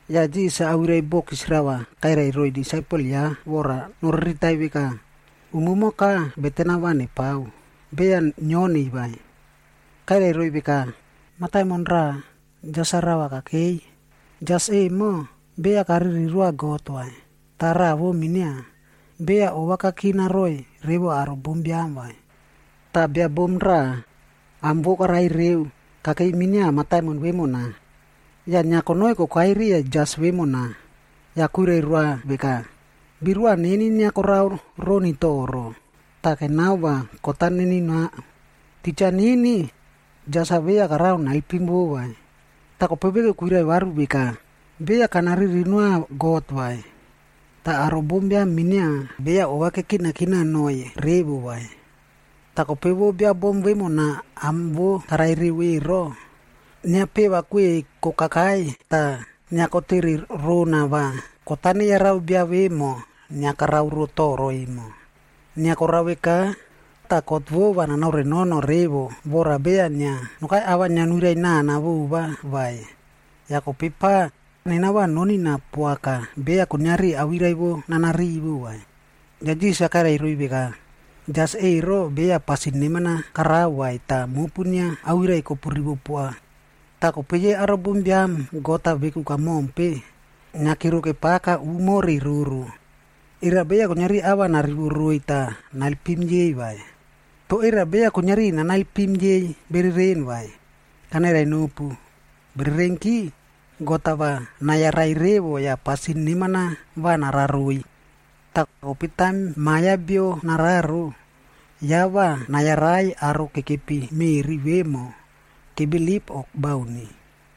Yah Jisas-a awirai bokis rava kairai roiy disaipel ya vora noriritai veka, umumoka beten-a va nepao, beya nioniy vai. Kairai roiy veka, “Mataimon raꞌa, jas rava kakei. Jas emo, beya kariri roa God vai, tah raꞌa vo minia, beya ova kakina roiy revo aro bombiam vai. Tah bia bom raꞌa, am vo karai reu, kokei minia mataimon vemona. Yah inia konoi kokai riya jas vemona. Yah kwirai roa veka, ‘Birua neni inia karao roni toro, tah kenao va kot-a nenunao.’ “Titja nini, jas-a beya karao naelpim vo vai. Tah kope veku kairai varu veka, ‘Beya kana riri noa God vai, tah aro bombiam minia beya ova kanakina noꞌoiy revo vai. Toh kope vo bia bom vemona am vo karai reu ero, inia peva kweꞌei kokakai tah inia kotere rona va kot-a neyarao bia vemo inia karao ro toro emo. Inia korao veka, tah kot vo va nanaore nono revo vora beya inia nokai ava inia nuirai nana vova vai. Yah kope pa, nena va nonina poaka beya kuiniari awirai vo nana rivo vai.’” Yah Jisas kairai roiy veka, “Jas ero beya pasin neman-a karao vai tah mopu inia awirai-a kopu rivo poa. Toh kope yei aro bombiam God-a veku kamompe, inia kero kepaka umo re roro. Era beya kuiniari ava narivo roiy tah naelpim yei vai? Toh era beya kuiniari nanaelpim yei bereren vai? Kanairai nopu, bererenki, God-a va nayarai revo yah pasin neman-a va narao roiy. Toh, kope taim Ma Biam ya Bio nararo, ya va nayarai aro kekepi meꞌri vemo, kebilip o bauni?”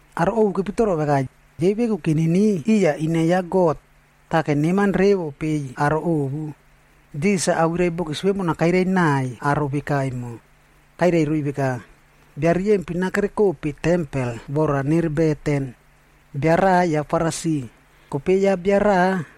Aro ovu kepitoro veka, yei veku keniniu iya ine ya God, tah keneman revo peiy aro ovu. Jisas-a awirai bokis vemona kairai naiy aro veka emo. Kairai roiy veka, “Bia riyempin-a kerekope tempel vora nere beten. Bia raꞌa ya Farisi, kope ya bia raꞌa,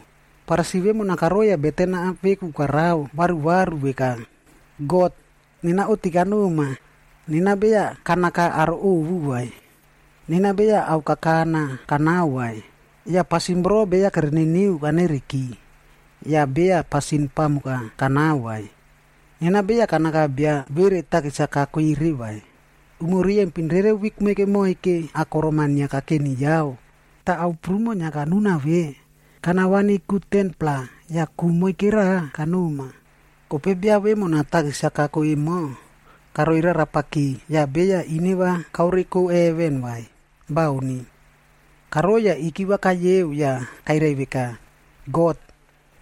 Farisi vemona karoiy yah beten-a veku karao varuvaru veka, ‘God, nena oꞌti kanoma, nena beya kanaka aro ovu vai. Nena beya ao kakana kanao vai, yah pasin voro beya kere niniu kane nereki, yah beya pasin pamuk-a kanao vai. Nena beya kanaka bia vere takis-a kako ero vai. Umo riyempin rere wik moike moike akorom-a inia kakeni yao, tah ao prumo inia kanuna ve, kana vani ku 10-pla yah ku moike raꞌa kanoma.’ “Kope ya bia vemona takis-a kako emo, karoi rarapaki yah beya ineva kaoreko heven vai, bauni! Karoi yah ikiva kayeob yah kairai veka, ‘God,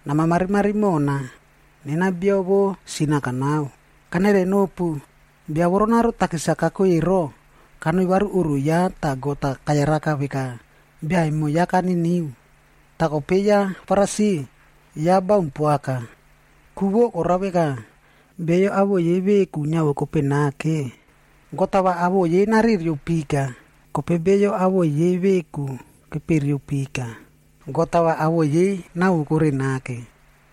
nama marimari mona. Nena bia vo sin-a kanao.’ “Kanairai nopu, bia voronaro takis-a kako ero, kanoi varu oꞌro ya tah God-a kayaraka veka, bia emo ya kaniniu. Toh kope ya Farisi, ya baun poaka. Ku vo korao veka, beyo awoꞌo yei veku niavokope nake, God-a va awoꞌo yei narereo pika, kope beyo awoꞌo yei veku kepereo pika, God-a va awoꞌo yei nawokore nake.”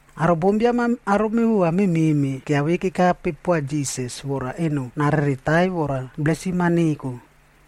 Aro bombiam-a aro mevova memeꞌme kiavei kekape poa Jisas vora eno nareretaiy vora blesim-a neko.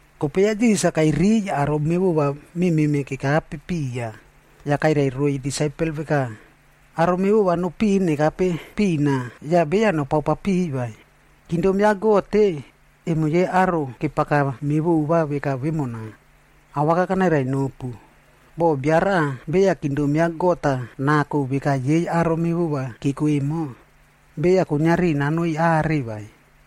Kope ya Jisas-a kairiy aro mevova memeꞌme kekape piya, yah kairai roiy disaipel veka, “Aro mevova nopiꞌin nekape pina yah beya nopao papiꞌiy vai. Kingdom ya God-e, emo yei aro kepaka mevova veka vemona. Awaka kanairai nopu, boh bia raꞌa beya kingdom ya God-a nako veka yei aro mevova keko emo, beya kuiniari nanoi are vai.”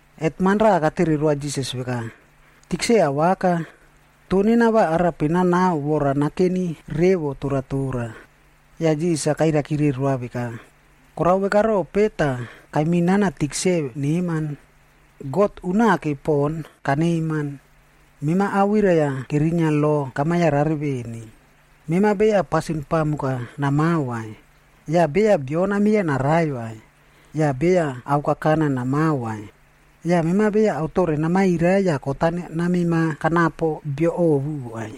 Hetman raꞌa katere roa Jisas veka, “Tikse awaka, toh nena va arape nanao vora laip vo nakeni revo toratora nanako?” Yah Jisas-a kairaikire roa veka, “Korao veka rope tah kaiminana tikse neman? God unake poꞌon kaneman. Mema awirai-a kerinia lo kama yarare veni, ‘Mema beya pasin pamuk-a namao vai, yah beya bio namieya narai vai, yah beya ao kakana namao vai. Yah mema beya ao tore namairai yah kot-a namemao kanapo bio ovu vai.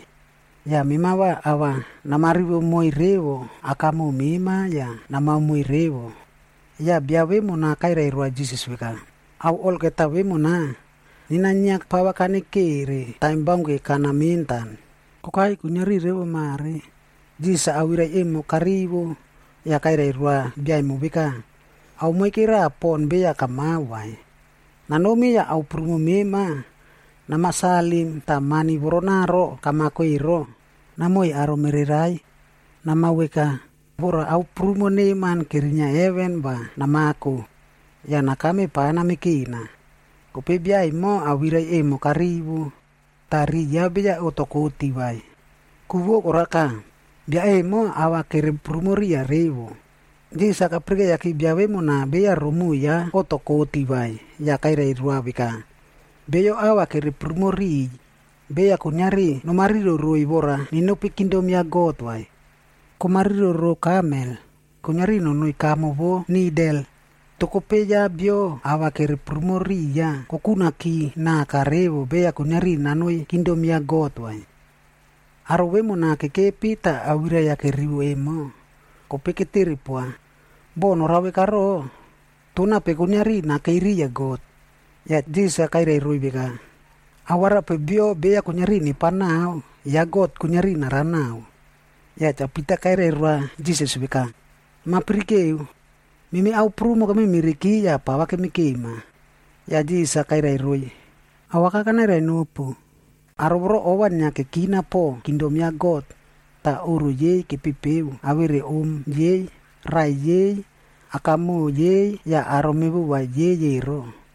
Yah mema va ava nama rivo moiy revo akamoꞌo mema yah namao moiy revod.’” Yah bia vemona kairai roa Jisas veka, “Ao olgeta vemonamo, nena inia pava kanekere taim baunke kana mentan, kokai kuiniari revo mare.” Jisas awirai emo karivo, yah kairai roa bia emo veka, “Ao moike raꞌa pon beya kamao vai. Nanomi yah ao prumo mema, namasalim tah mani voronaro kamako ero, namoiy aro mererai. Namao veka, vora ao prumo neman kerinia heven va namako. Yah nakame pava namekena.” Kope bia emo awirai emo karivo, tah riꞌi ya beya oꞌto koti vai. Ku vo karaka, bia emo ava kere prumo riya revo. Jisas-a kapirikeiya bia vemona beya romoꞌo ya oꞌto koti vai, yah kairai roa veka, “Beyo ava kere prumo riꞌiy, beya kuiniari nomariro roiy vora nenopi kingdom ya God vai. Komariro rou kamel,e kuiniari nonoi kamo vo nidel, toh kope ya bio ava kere prumo riya kokunaki naka revo beya kuiniari nanoi kingdom ya God vai.” Aro vemona kekepi tah awirai-a kerivo emo, kope ketere poa, “Boh norao veka voro, toh nape kuiniari nakei riya God?” Yah Jisas-a kairai roiy veka, “Ao arape bio beya kuiniari nepao nao, ya God-a kuiniari narao naꞌao.” Yah Cha Pita kairai roa Jisas veka, “Nama pirikeu. Memi ao prumo kememereki yah pava kemekema.” Yah Jisas-a kairai roiy, “Awaka kanairai nopu, aro voro ova inia kekina poꞌo kingdom ya God, tah oꞌro yei kepepeo awere om yei, raꞌai yei, akamoꞌo yei yah aro mevova yei ero,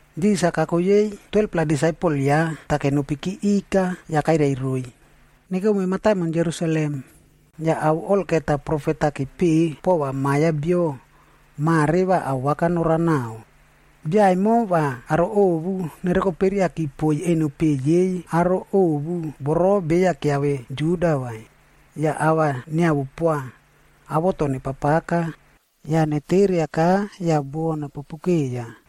Jisas-a kako yei 12-pla disaipel ya tah kenopi ikaki yah kairai roiy, “Nekome mataimon Jerusalem, yah ao olgeta profet-a kepeꞌe pova Ma Biam ya Bio, mare va awaka norao naꞌao. Bia emo va aro ovu nerokoperiaki poiy eno peꞌe yei aro ovu voro beya keave Juda vai.f Yah ava niawo poa, awoto nepapaka, yah neteriaka yah buo nepopu keiya.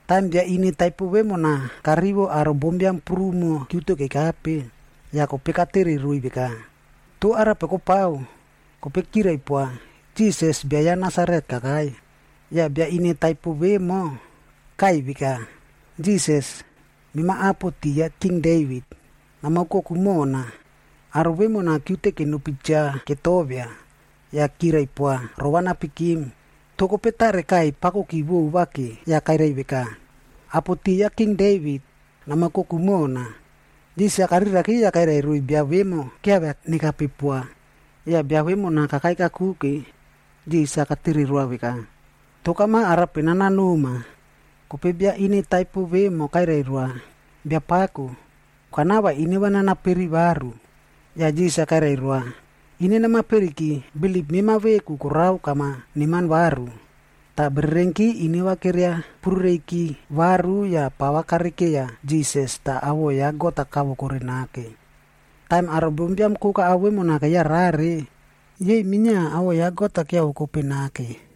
Taim bia ine taipo vemona karivo aro bombiam prumo kiute kekape, yah kope katere roiy veka, “Toh arape kopao?” Kope kirai poa, “Jisas, bia ya Nasaret kakai.” Yah bia ine taipo vemo, kaꞌai veka, “Jisas, mema apo ti ya king Devit,g nama oukoku mona.” Aro vemona kiute kenopi cha ketovia, yah kirai poa rova napikim. Toh kope tare kaꞌai pakoki vova ke yah kairai veka, “Apo ti ya King Devit, nama oukoku mona.” Jisas-a kariraki yah kairai roiy bia vemo kiavia nekape poa. Yah bia vemona kakai kakuke, Jisas-a katere roa veka, “Toh kama arape nanao noma?” Kope bia ine taipo vemo kairai roa, “Biapako, kanao va ineva nana peri varu.” Yah Jisas-a kairai roa, “Ine namaperiki, bilip mema veku korao kama neman varu.” Tah bererenki ineva keria purureiki varu yah pava karekeiya Jisas tah awoꞌo ya God-a kavokore nake. Taim aro bombiam koka ao vemona keyarare, yei minia awoꞌo ya God-a kiavokope nake.